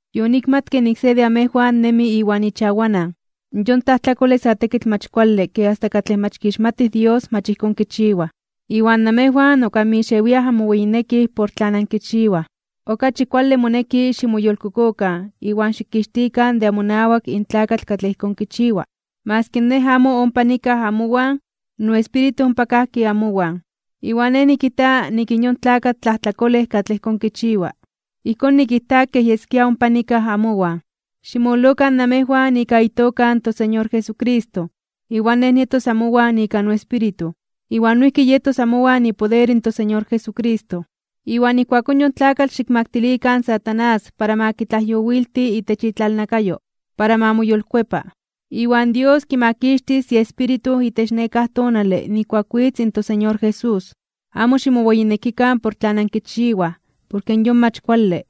Yonikmatke nik se de amejwan nemi iwan ichawanan. Yon tlajtlakole sa tekitl mach kuale ke asta katlej mach kixmatij Dios mach ijkón kichiwaj. Iwan namejwan ok anmixewiaj anmoweyinekij por tlan ankichiwaj. Okachi kuale moneki ximoyolkokokan iwan xikixtikan de amonawak in tlakatl katlej ijkón kichiwa. Maski nej amo ompa nikaj amowan, noespíritu ompa kajki amowan. Iwan nej nikijta nik in yon tlakatl tlajtlakolej katlej ijkón kichiwa, ijkón nikijta kej yeskia ompa nikaj amowan. Ximololokan namejwan ika itoka in toSeñor Jesucristo, iwan nej nietos amowan ika noespíritu, iwan noijki yetos amowan ipoder in toSeñor Jesucristo. Iwan ijkuakón yon tlakatl xikmaktilikan in Satanás para ma kitlajyowilti itech itlalnakayo, para ma moyolkuepa. Iwan Dios kimakixtis iespíritu itech nekáj tonale nijkuak witz in toSeñor Jesús. Amo ximoweyinekikan por tlan ankichiwaj porke yon mach kuale.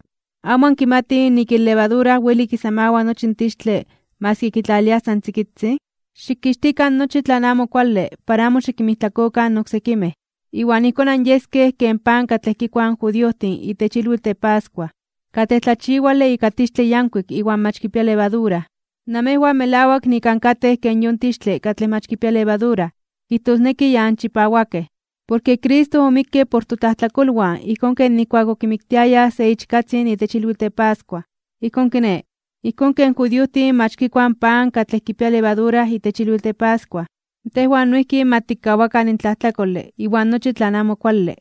¿Amo ankimatij nik in levadura weli kisamawa nochi in tixtle maski kitlaliliaj san tzikitzin? Xikixtikan nochi tlan amo kuale para amo xikinmijtlakokan in oksekimej. Iwan ijkón anyeskej ken pan katlej kikuaj in judiojtin itech ilwitl de pascua, katlej tlachiwale ika tixtle yankuik iwan mach kipia levadura. Namejwan melawak nik ankatej ken yon tixtle katlej mach kipia levadura, kijtosneki ya anchipawakej. Porke Cristo omikke por totlajtlakolwan ijkón ken nijkuak okimiktiayaj se ichkatzin itech ilwitl de pascua. Ijkón kiné, ijkón ken judiojtin mach kikuaj in pan katlej kipia levadura itech ilwitl de pascua, tejwan noijki ma tikkawakan in tlajtlakole iwan nochi tlan amo kuale,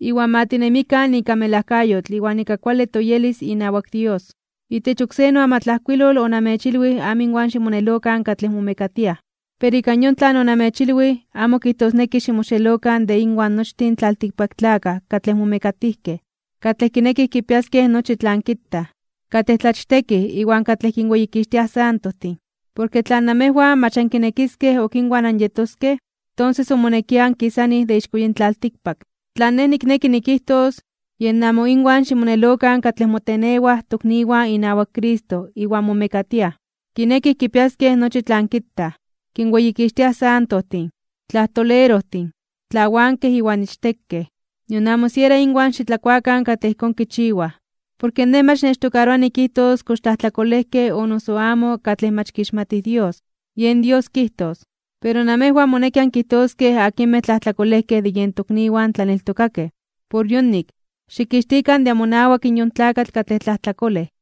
iwan ma tinemikan ika melajkayotl iwan ika kuale toyelis inawak Dios. Itech oksé noamatlajkuilol onamechilwij amo inwan ximonelokan katlej momekatiaj. Pero ika yon tlan onamechilwij, amo kijtosneki ximoxelokan de inwan nochtin in tlaltikpaktlakaj katlej momekatijkej, katlej kinekij kipiaskej nochi tlan kitaj, katlej tlachtekij iwan katlej kinweyikixtiaj santojtin. Porke tla namejwan mach ankinekiskej ok inwan anyetoskej, tonses omonekia ankisanij de ixko yin tlaltikpak. Tlan nej nikneki nikijtos, yen amo inwan ximonelokan katlej motenewaj tokniwan inawak Cristo iwan momekatiaj, kinekij kipiaskej nochi tlan kitaj, kinweyikixtiaj santojtin, tlajtolerojtin, tlawankej iwan ichtekej. Nion amo siera inwan xitlakuakan katlej ijkón kichiwaj. Porke nej mach nechtokaroa nikijtos kox tlajtlajkolejkej o noso amo katlej mach kixmatij Dios. Yen Dios kijtos. Pero namejwan moneki ankijtoskej akinmej tlajtlakolejkej de yen tokniwan tlaneltokakej. Por yonik, xikixtikan de amonawak in yon tlakatl katlej tlajtlakolej.